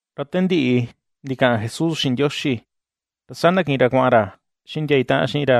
Ra te ndiꞌi ndikaꞌan Jesús xiꞌin Ndioxi, ra saa ndakiꞌin ra kuaꞌan ra xiꞌin ndia itaꞌan xiꞌin ra,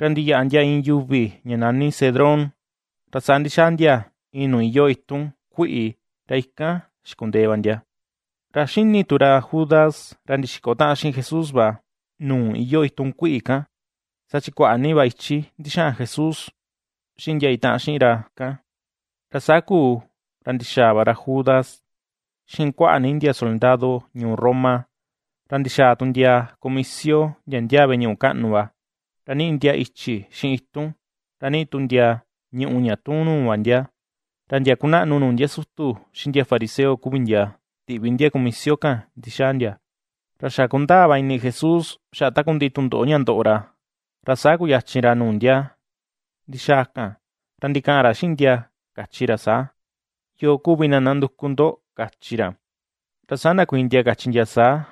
ra ndiyaꞌa ndia iin yuvi ña nani Cedrón. Ra saa ndixaa ndia, iin nuu iyoo itun kuiꞌi, ra ikan xikundee va ndia. Ra ^xini tu ra Judas, ra ndixiko taꞌan xiꞌin Jesús va, nuu iyoo itun kuiꞌi kan, saa chi kuaꞌa ni va ichi ndixaꞌan Jesús xiꞌin ndia itaꞌan xiꞌin ra ikan. Ra saa kuu, ra ndixaa va ra Judas xiꞌin kuaꞌa ni ndia soldado ñuu Roma, ra ndixaa tu ndia kumisio, ndia ndiaa veꞌe ñuꞌu kaꞌnu va, ra niꞌi ndia ichi xiꞌin itun, ra niꞌi tu ndia ñùꞌù ña tuun nuu va ndia; ra ndia kunaꞌnu nuu ndia sutu, xiꞌin ndia fariseo kuvi ndia, tiꞌvi ndia kumisio kan ndixaa ndia. Ra xa kundaa va ini Jesús xaꞌa takundiꞌi tundoꞌo ña ndoꞌo ra, ra saa kuyachin ra nuu ndia ndixaa kan, ra ndikaꞌan ra xiꞌin ndia, kachi ra saa: ―¿Yoo kuvi na nanduku ndo? ―kachi ra. Ra saa ndakuiin ndia kachi ndia saa: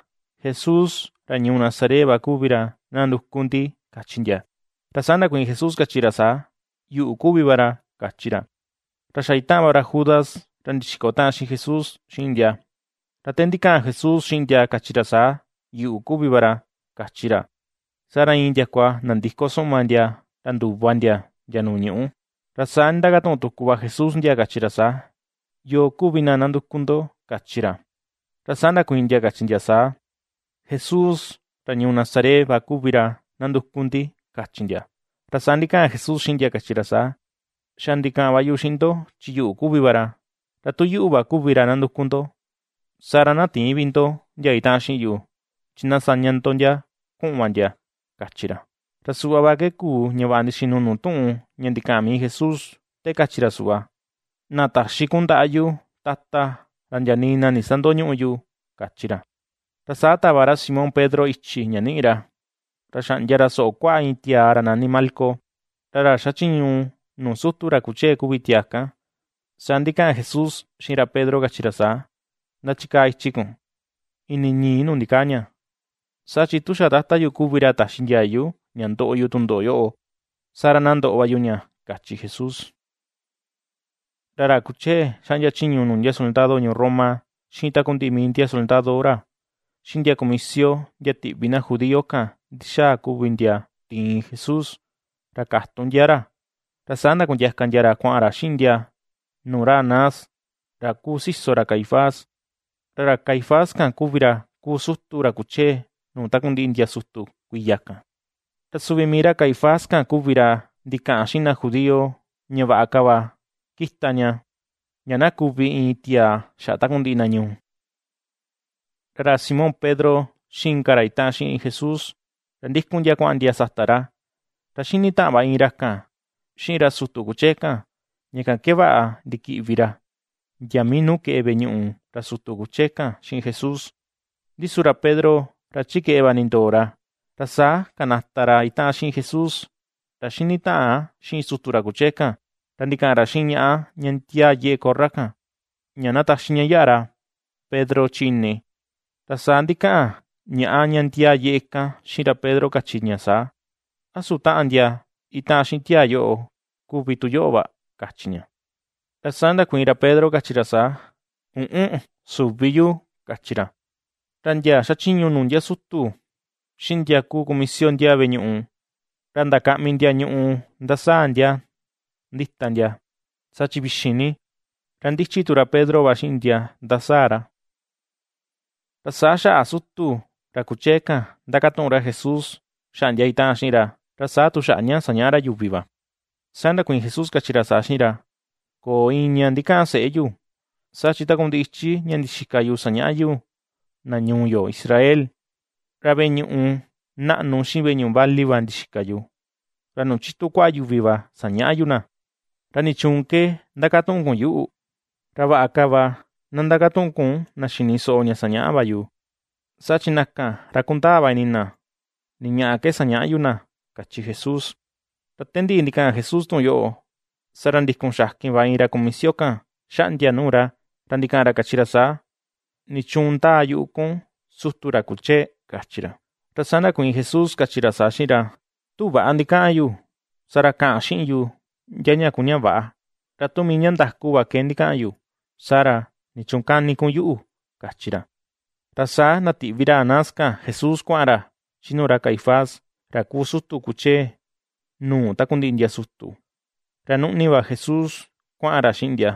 ―Jesús ra ñuu Nazaret va kuvi ra nanduku ndi ―kachi ndia. Ra saa ndakuiin Jesús, kachi ra saa: ―Yuꞌu kuvi va ra ―kachi ra. Ra xa itaꞌan va ra Judas, ra ndixiko taꞌan xiꞌin Jesús, xiꞌin ndia. Ra te ndikaꞌan Jesús xiꞌin ndia kachi ra saa: “Yuꞌu kuvi va ra”, kachi ra, saa ra iin ndiakua nandiko suꞌma ndia, ra nduva ndia, ndia nuu ñuꞌu. Ra saa nindakatuꞌun tuku va Jesús ndia, kachi ra saa: ―¿Yoo kuvi na nanduku ndo? ―kachi ra. Ra saa ndakuiin ndia, kachi ndia saa: ―Jesús, ra ñuu Nazaret va kuvi ra nanduku ndi ―kachi ndia. Ra saa ndikaꞌan Jesús xiꞌin ndia kachi ra saa: ―Xa ndikaꞌan va yu xiꞌin ndo, chi yuꞌu kuvi va ra. Ra tu yuꞌu va kuvi ra nanduku ndo, saa ra na tïin vi ndo, ndia itaꞌan xiꞌin yu, chi na saña ndia kuꞌun va ndia ―kachi ra. Ra suꞌva ke kuu, ña vaꞌa ndixinu nuu tuꞌun ña ndikaꞌan mii Jesús, te kachi ra suꞌva; “Na taxi kun ndaꞌa yu, Tata, ra ndia nii na ndisandoñüꞌu yu”, kachi ra. Ra saa tava ra Simón Pedro ichi ña niꞌi ra, ra xaꞌndia ra soꞌo kuaꞌa iin tiaa ra nani Malco, ra ra xachiñu nuu sutu ra kuchee kuvi tiaa kan. Saa ndikaꞌan Jesús xiꞌin ra Pedro, kachi ra saa: ―Ndachikaa ichi kun, ini ñii nuu ndikaa ña. Saa chi tu xa Tata yu kuvi ra taxi ndiayu, ña ndoꞌo yu tundoꞌo yoꞌo, saa ra na ndoꞌo va yu ña ―kachi Jesús. Ra ra kuchee xaꞌndia chiñu nuu ndia soldado ñuu Roma, xiꞌin takundiꞌi mii ndia soldado ra, xiꞌin ndia kumisio ndia tiꞌvi na judío kan ndixaa kuvi ndia tiin Jesús, ra katun ndia ra. Ra saa ndakundiaka ndia ra kuaꞌan ra xiꞌin ndia nuu ra Anás, ra kuu siso ra Caifás. Ra ra Caifás kan kuvi ra kuu sutu, ra kuchee nuu takundiꞌi ndia sutu kuiya kan. Ra suvi mii ra Caifás kan kuvi ra ndikaꞌan xiꞌin na judío, ña vaꞌa ka va kita ña, ña na kuvi iin tiaa xaꞌa takundiꞌi na ñuu. Ra ra Simón Pedro, xiꞌin inka ra itaꞌan xiꞌin Jesús, ra ndikun ndia kuaꞌan ndia sata ra. Ra ^xini taꞌan va iin ra kan xiꞌin ra sutu kuchee kan, ña kan ke vaꞌa ndikiꞌvi ra, ndia mii nuu keꞌe veꞌe ra sutu kuchee kan xiꞌin Jesús; ndi su ra Pedro, ra chi keꞌe va nindoo ra. Ra saa kanata ra itaꞌan xiꞌin Jesús, ra xinitaꞌan xiꞌin sutu ra kuchee kan, ra ndikaꞌan ra xiꞌin ñaꞌa ña ndiaa yeꞌe korra kan, ña na taxi ña yaꞌa ra Pedro chi ini. Ra saa ndikaꞌan ñaꞌa ña ndiaa yeꞌe kan xiꞌin ra Pedro, kachi ña saa: ―¿A su taꞌan ndia itaꞌan xiꞌin tiaa yoꞌo, kuvi tu yoꞌo va? ―kachi ña. Ra saa ndakuiin ra Pedro, kachi ra saa: ―Üꞌun, süvi yu ―kachi ra. Ra ndia xachiñu nuu ndia sutu, xiꞌin ndia kuu kumisio ndiaa veꞌe ñuꞌu, ra ndakaꞌmi ndia ñuꞌu ndasaa ndia ndita ndia, saa chi vixin ni, ra ndichi tu ra Pedro va xiꞌin ndia ndasaa ra. Ra saa xaꞌa sutu ra kuchee kan, ndakatuꞌun ra Jesús xaꞌa ndia itaꞌan xiꞌin ra, ra saa tu xaꞌa ña sañaꞌa ra yuvi va. Saa ndakuiin Jesús, kachi ra saa xiꞌin ra: ―Köo iin ña ndikaꞌan seꞌe yu, saa chi takundiꞌi ichi ña ndixika yu sañaꞌa yu na ñuu yo Israel, ra veꞌe ñuꞌu naꞌnu xiꞌin veꞌe ñuꞌu vali va ndixika yu, ra nuu chitu kuaꞌa yuvi va sañaꞌa yu na. ¿Ra nichuun ke ndakatuꞌun kun yuꞌu? Ra vaꞌa ka va na ndakatuꞌun kun na xini soꞌo ña sañaꞌa va yu, saa chi na kan ra kundaa va ini na, ni ñaꞌa ke sañaꞌa yu na ―kachi Jesús. Ra te ndikaꞌan Jesús tuꞌun yoꞌo, saa ra ndikun xakin va iin ra kumisio kan xaꞌndia nuu ra, ra ndikaꞌan ra kachi ra saa: ―¿Nichuun ndaa yuꞌu kun, sutu ra kuchee? ―kachi ra. Ra saa ndakuiin Jesús, kachi ra saa xiꞌin ra: ―Tu väꞌa ndikaꞌan yu, saa ra kaꞌan xiꞌin yu ndia ña kuu ña väꞌa; ra tu mii ña ndaku va ke ndikaꞌan yu, saa ra, ¿nichuun kani kun yuꞌu? ―kachi ra. Ra saa ndatiꞌvi ra Anás kan Jesús kuaꞌan ra chi nuu ra Caifás, ra kuu sutu kuchee nuu takundiꞌi ndia sutu, ra nuꞌni va Jesús kuaꞌan ra xiꞌin ndia.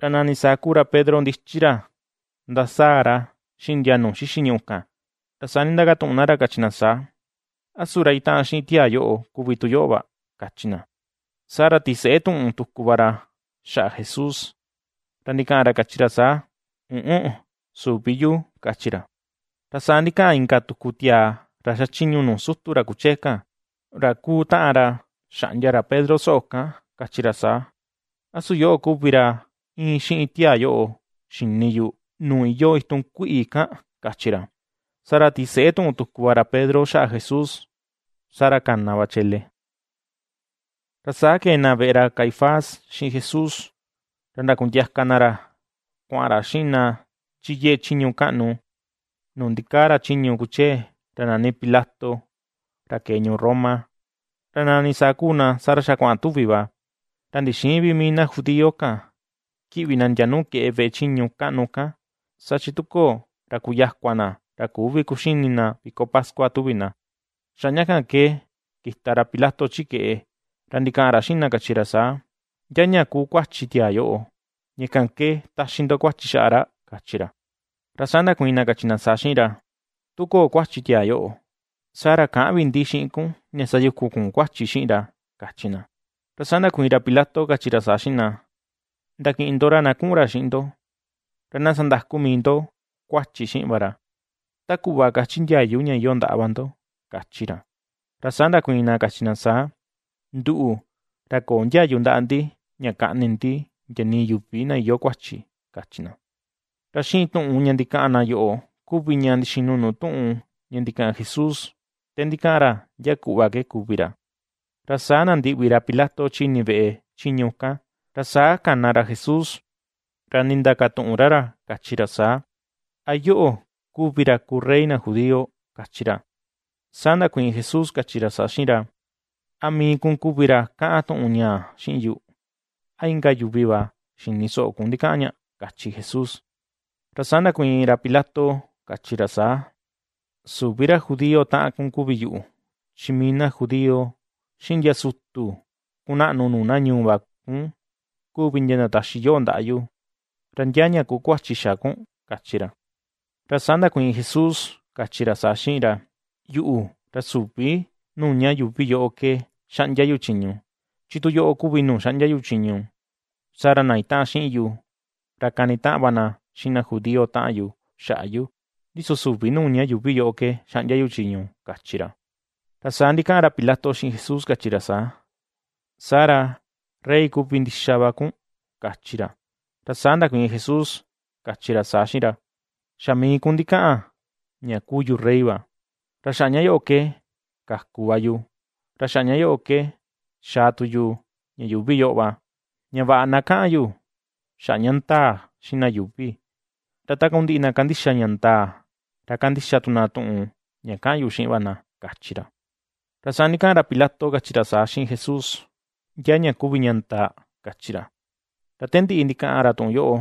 Ra nani saa kuu ra Pedro ndichi ra ndasaa ra xiꞌin ndia nuu xixi ñuꞌu kan, ra saa nindakatuꞌun na ra kachi na saa: ―¿A su ra itaꞌan xiꞌin tiaa yoꞌo, kuvi tu yoꞌo va? ―kachi na. Saa ra tiseꞌe tuꞌun tuku va ra xaꞌa Jesús, ra ndikaꞌan ra kachi ra saa: ―Üꞌun, süvi yu ―kachi ra. Ra saa ndikaꞌan inka tuku tiaa ra xachiñu nuu sutu ra kuchee kan, ra kuu taꞌan ra xaꞌndia ra Pedro soꞌo kan, kachi ra saa: ―¿A su yoꞌo kuvi ra íin xiꞌin tiaa yoꞌo, xini yu nuu iyoo itun kuiꞌi kan? ―kachi ra. Saa ra tiseꞌe tuꞌun tuku va ra Pedro xaꞌa Jesús, saa ra kana va chele. Ra saa kee na veꞌe ra Caifás xiꞌin Jesús, ra ndakundiaka na ra kuaꞌan ra xiꞌin na chi yeꞌe chiñu kaꞌnu, nuu ndikaa ra chiñu kuchee, ra nani Pilato ra kee ñuu Roma. Ra nani saa kuu na, saa ra xa kuaꞌan tuvi va, ra ndixïin vi mii na judío kan kiꞌvi na ndia nuu keꞌe veꞌe chiñu kaꞌnu kan, saa chi tu köo ra kuyakua na ra küvi kuxini na viko pascua tuvi na. Xaꞌa ña kan ke kita ra Pilato chi keꞌe, ra ndikaꞌan ra xiꞌin na kachi ra saa: ―¿Ndia ña kuu kuachi xa tiaa yoꞌo, ña kan ke taxi ndo kuachi xaꞌa ra? ―kachi ra. Ra saa ndakuiin na kachi na saa xiꞌin ra: ―Tu köo kuachi tiaa yoꞌo, saa ra käꞌan vi ndi xiꞌin kun ña sayukun kun kuachi xiꞌin ra ―kachi na. Ra saa ndakuiin ra Pilato, kachi ra saa xiꞌin na: ―Ndakiꞌin ndo ra na kuꞌun ra xiꞌin ndo, ra na sandaku mii ndo kuachi xiꞌin va ra, ta kuꞌva kachi ndiayu ña iyoo ndaꞌa va ndo ―kachi ra. Ra saa ndakuiin na kachi na saa: ―Nduꞌu, ra köo ndiayu ndaꞌa ndi ña kaꞌni ndi ndia nii yuvi na iyoo kuachi ―kachi na. Ra xiꞌin tuꞌun ña ndikaꞌan na yoꞌo kuvi ña ndixinu nuu tuꞌun ña ndikaꞌan Jesús, te ndikaꞌan ra ndia kuꞌva ke kuvi ra. Ra saa nandiꞌvi ra Pilato chi ini veꞌe chiñu kan, ra saa kana ra Jesús, ra ndindakatuꞌun ra ra kachi ra saa: ―¿A yoꞌo kuvi ra kuu rey na judío? ―kachi ra. Saa ndakuiin Jesús, kachi ra saa xiꞌin ra: ―¿A mii kun kuvi ra kaꞌan tuꞌun ñaa xiꞌin yu, a inka yuvi va xini soꞌo kun ndikaꞌan ña? ―kachi Jesús. Ra saa ndakuiin ra Pilato, kachi ra saa: ―Süvi ra judío taꞌan kun kuvi yuꞌu. Chi mii na judío, xiꞌin ndia sutu kunaꞌnu nuu na ñuu va kun kuvi ndia ndataxi yoꞌo ndaꞌa yu. ¿Ra ndia ña ku kuachi xa kun? ―kachi ra. Ra saa ndakuiin Jesús, kachi ra saa xiꞌin ra: ―Yuꞌu, ra süvi nuu ña yuuvi yoꞌo ke xaꞌndia yu chiñu; chi tu yoꞌo kuvi nuu xaꞌndia yu chiñu, saa ra na itaꞌan xiꞌin yu, ra kanitaꞌan va na xiꞌin na judío taꞌan yu xaꞌa yu. Ndi su süvi nuu ña yuuvi yoꞌo ke xaꞌndia yu chiñu ―kachi ra. Ra saa ndikaꞌan ra Pilato xiꞌin Jesús, kachi ra saa: ―¿Saa ra, rey kuvi ndixa va kun? ―kachi ra. Ra saa ndakuiin Jesús, kachi ra saa xiꞌin ra: ―Xa mii kun ndikaꞌan ña kuu yu rey va. Ra xaꞌa ña yoꞌo ke kaku va yu, ra xaꞌa ña yoꞌo ke, xaa tu yu ña yuuvi yoꞌo va, ña vaꞌa na kaꞌan yu xaꞌa ña ndaa xiꞌin na yuuvi. Ra takundiꞌi na kandixa ña ndaa, ra kandixa tu na tuꞌun ña ^kaꞌan yu xiꞌin va na ―kachi ra. Ra saa ndikaꞌan ra Pilato kachi ra saa, xiꞌin Jesús: ―¿Ndia ña kuvi ña ndaa? ―kachi ra. Ra te ndiꞌi ndikaꞌan ra tuꞌun yoꞌo,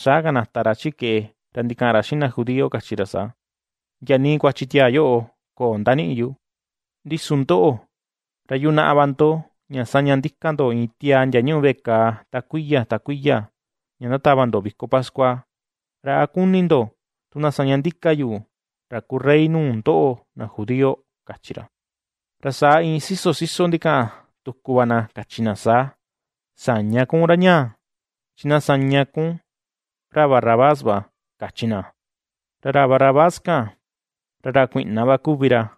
saa kanata ra chi keꞌe ra ndikaꞌan ra xiꞌin na judío, kachi ra saa: ―Ndia nii kuachi tiaa yoꞌo köo ndaniꞌi yu. Ndi su ndoꞌo, ra yunaꞌa va ndo ña saña ndika ndo iin tiaa ndia ñúꞌu veꞌe kàà ta kuiya, ta kuiya ña ndatava ndo viko pascua; ¿ra a kuni ndo tu na saña ndika yu, ra kuu rey nuu ndoꞌo na judío? ―kachi ra. Ra saa iin siso siso ndikaꞌan tuku va na, kachi na saa: ―¡Säña kun ra ñaa! ¡Chi na saña kun ra Barrabás va! ―kachi na. Ra ra Barrabás kan, ra ra kuiꞌna va kuvi ra.